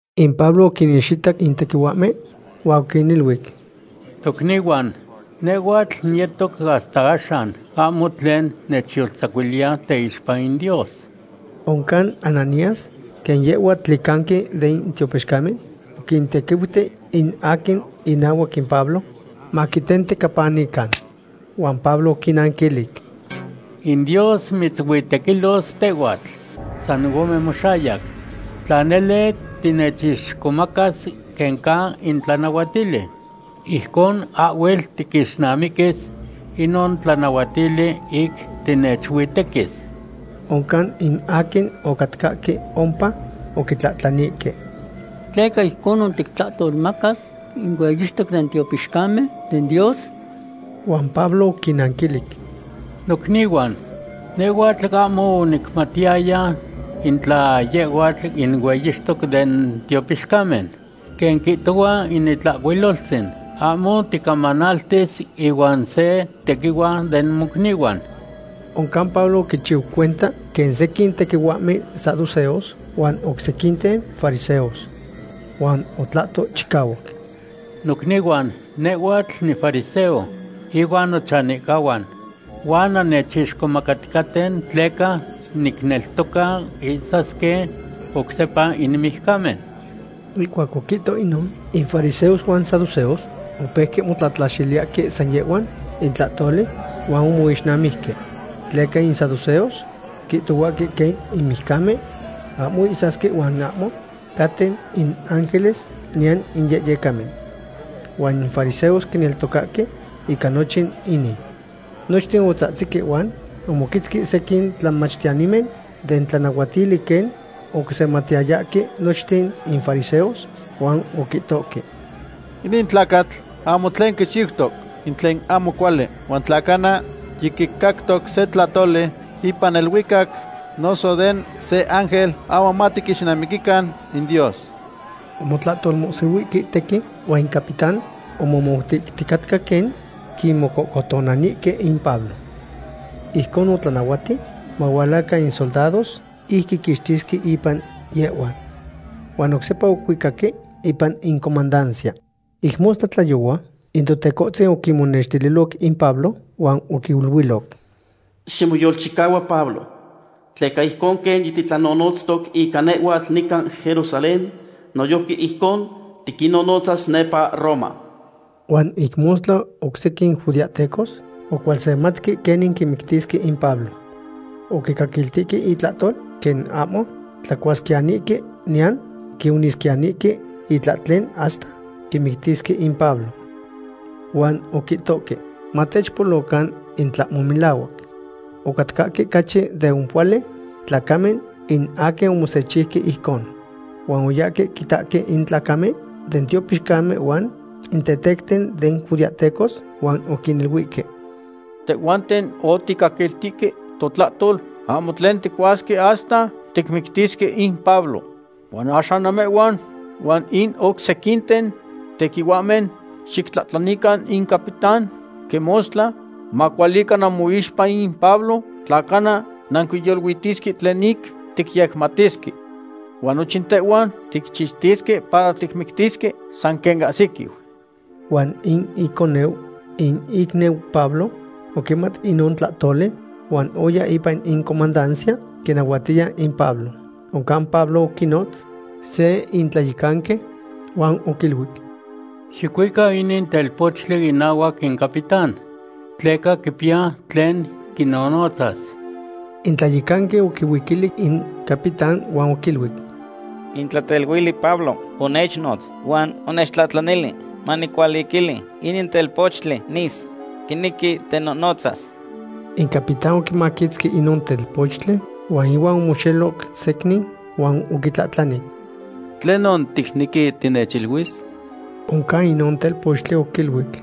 In Pablo oquinixitac in tequihuahmen huan oquiniluic: ―Tocnihuan, nehhuatl niyetoc hasta axan ahmo tlen nechyoltzacuiliya teixpa in Dios. Oncan Ananías, quen yehhua tlicanqui den tiopixcamen, oquintequiuti in aquin inahuac in Pablo maquitentecapanican. Huan Pablo oquinanquilic: ―¡In Dios mitzuitequilos tehhuatl, san ome moxayac! Tla nele tinechixcomacas quen ca in tlanahuatili, ijcon ahhuel tiquixnamiquis inon tlanahuatili ic tinechuitequis. Oncan in aquin ocatcahque ompa oquitlahtlanihque: ―¿Tleca ijconon tictlahtolmacas in hueyixtoc den tiopixcamen den Dios? Huan Pablo oquinanquilic: ―Nocnihuan, nehhuatl ahmo onicmatiyaya in tla yehhuatl in hueyixtoc den tiopixcamen. Quen quihtohua in Itlahcuiloltzin: “Ahmo ticamanaltis ihuan se tequihua den mocnihuan.” Oncan Pablo oquichiu cuenta quen sequin tequihuahmen saduceos huan oc sequinten fariseos. Huan otlahto chicahuac: ―Nocnihuan, nehhuatl nifariseo, ihuan nochanihcahuan. Huan nannechixcomacaticaten tleca nicneltoca ihsasque oc sepa in mijcamen. Ihcuac oquihto inon, in fariseos huan in saduceos opeuque motlatlaxiliyahque san yehhuan in tlahtoli, huan omoixnamijque. Tleca in saduceos quihtohuahque quen in mijcamen ahmo ihsasque huan ahmo caten in ángeles, niyan in yehyecamen. Huan in fariseos quineltocahque ica nochin inin. Nochten otzahtzihque huan omoquetzque sequin tlamachtiyanimen den tlanahuatili quen oquisematiyayahque nochten in fariseos huan oquihtohque: ―Inin tlacatl ahmo tlen quichiutoc in tlen ahmo cuali, huan tla cana yiquicactoc se tlahtoli ipan neluicac noso den se ángel, ahmo matiquixnamiquican in Dios. Omotlahtolmohsihuihque tequin huan in capitán omomoutihticatca quen quimocohcotonanihque in Pablo. Ijcon otlanahuati mahualacan in soldados ic quiquixtisque ipan yehhuan. Huan oc sepa ocuicaque ipan in comandancia. Ic mostla tlayohua in Totecohtzin oquimonextililoc in Pablo huan oquiluiloc: ―Ximoyolchicahua Pablo, tleca ijcon quen yititlanonotztoc ica nehhuatl nican Jerusalén, noyojqui ijcon tiquinnonotzas nepa Roma. Huan ic mostla oc sequin judeahtecos ocualsematque quenin quimictisque in Pablo. Oquicaquiltihque intlahtol quen ahmo tlacuasquiyanihque niyan quionisquiyanihque itlahtlen hasta quimictisque in Pablo. Huan oquihtohque: “Matechpolocan in tlahmo melahuac.” Ocatcahque ocachi de ompohuali tlacamen in aquin omosechiuque ijcon. Huan oyahque quitahque in tlicancamen den tiopixcamen huan in tetecten den judeahtecos huan oquiniluihque: ―Tehhuanten oticaquiltihque totlahtol ahmo tlen ticuasque hasta ticmictisque in Pablo. Huan axan namehhuan huan in oc sequinten tequihuahmen xictlahtlanilican in capitán quen mostla macualica namoixpa in Pablo, tla cana nanquiyoluitisque tlen ic ticyecmatisque. Huan nochin tehhuan ticchixtiyesque para ticmictisque san quen ahsiquiu. Huan in iconeu in icniu Pablo oquimat inon tlahtoli huan oya ipan in comandancia quinahuatiya in Pablo. Oncan Pablo oquinotz se in tlayecanqui huan oquiluic: ―Xicuica inin telpochtli inahuac in capitán, tleca quipiya tlen quinohnotzas. In tlayecanqui oquihuiquili in capitán huan oquiluic: ―In tlateluili Pablo onechnotz huan onechtlahtlanili manicualiquili inin telpochtli nis. Quinequi tenohnotzas. In capitán oquimaquitzqui inon telpochtli huan ihuan omoxeloc secnin huan oquitlahtlani: ―¿Tlenon ticnequi tinechiluis? Oncan inon telpochtli oquiluic: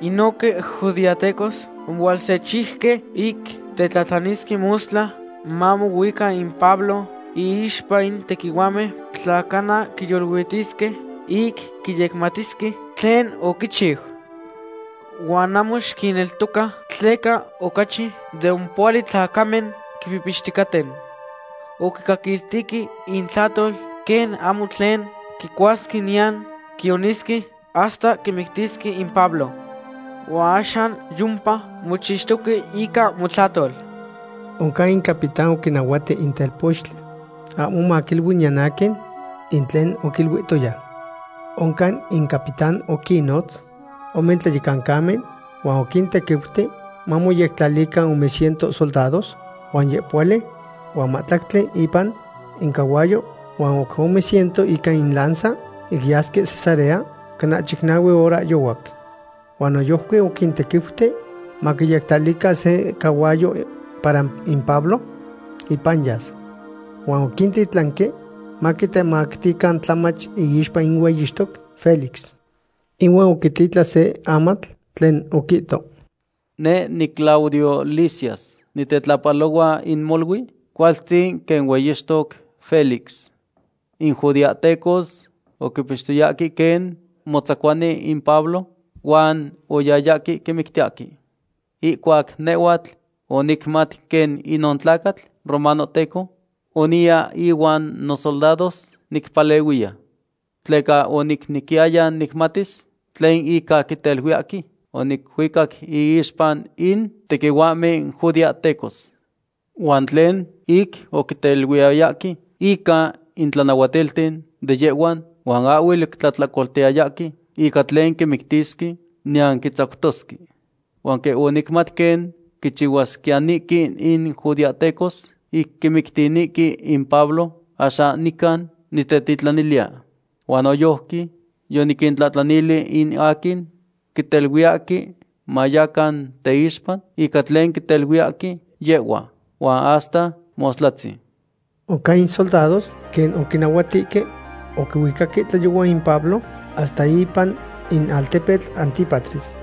―Inohque judeahtecos omohualsechiuque ic tetlahtlanilisque mostla mamohuica in Pablo iixpa in tequihuahmen tla cana quiyoluitisque ic quiyecmatisque tlen oquichiu. Huan ahmo xiquinneltoca tleca ocachi de ompohuali tlacamen quipihpixticaten. Oquicaquiltihque intlahtol quen ahmo tlen quicuasque niyan quionisque hasta quimictisque in Pablo. Huan axan yompa mochixtoque ica motlahtol. Oncan in capitán oquinahuati in telpochtli ahmo maquiilui niyan aquin in tlen oquiluihtoya. Oncan in capitán oquinnotz ome tlayecancamen huan oquintequiuti mamoyectlalican ome ciento soldados huan yehpohuali huan mahtlactli ipan incahuayo, huan oc ome ciento ica in lanza ic yasque Cesarea cana chicnahue horahyohuac. Huan noyojqui oquintequiuti maquiyectlalican se cahuayo para in Pablo ipan yas. Huan oquintitlanque maquitemactican tlamach iixpa in hueyixtoc Félix. Inuan oquititlan se amatl tlen oquihto: “Neh niClaudio Lisias nitetlahpalohua in molui cualtzin quen hueyixtoc Félix. In judeahtecos oquipixtoyahque quen motzacuani in Pablo huan oyayahque quimictiyahque. Ihcuac nehhuatl onicmat quen inon tlacatl romanohteco, oniya ihuan nosoldados nicpalehuiya. Tleca onicnequiyaya nicmatis tlen ica quiteluiyahque, onicuicac iixpa in tequihuahmen judeahtecos. Huan tlen ic oquiteluiyayahque ica in tlanahualtilten de yehhuan, huan ahhuel oquitlahtlacoltiyayahque ica tlen quimictisque niyan quitzactosque. Huan quen onicmat quen quichihuasquiyanihque in judeahtecos ic quimictinihque in Pablo, axan nican nitetitlaniliya. Huan noyojqui yoniquintlahtlanili in aquin quiteluiyahque mayacan teixpa ica tlen quiteluiyahque yehhuan. Huan hasta mostlatzin.” Oncan in soldados, quen oquinnahuatihque, oquihuicahque tlayohua in Pablo hasta ipan in altepetl Antípatris.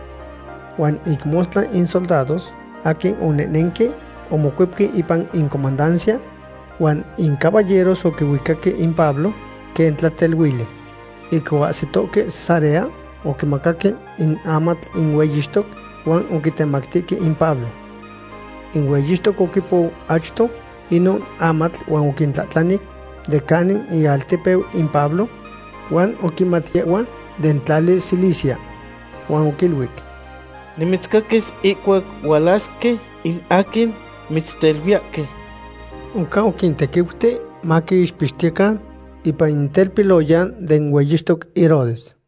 Huan ic mostla in soldados aquin onehnenque omocuepque ipan in comandancia huan in caballeros oquihuicahque in Pablo quen tlateluili. Ic oahsitohque Cesarea oquimacaque in amatl in hueyixtoc huan oquitemactihque in Pablo. In hueyixtoc oquipou achto inon amatl huan oquitlahtlanic de canin ialtepeu in Pablo, huan oquimat yehhua den tlali Cilicia. Huan oquiluic: ―Nimitzcaquis ihcuac hualasque in aquin mitzteluiyahque. Oncan oquintequiuti maquixpixtiyecan ipan in telpiloyan den hueyixtoc Herodes.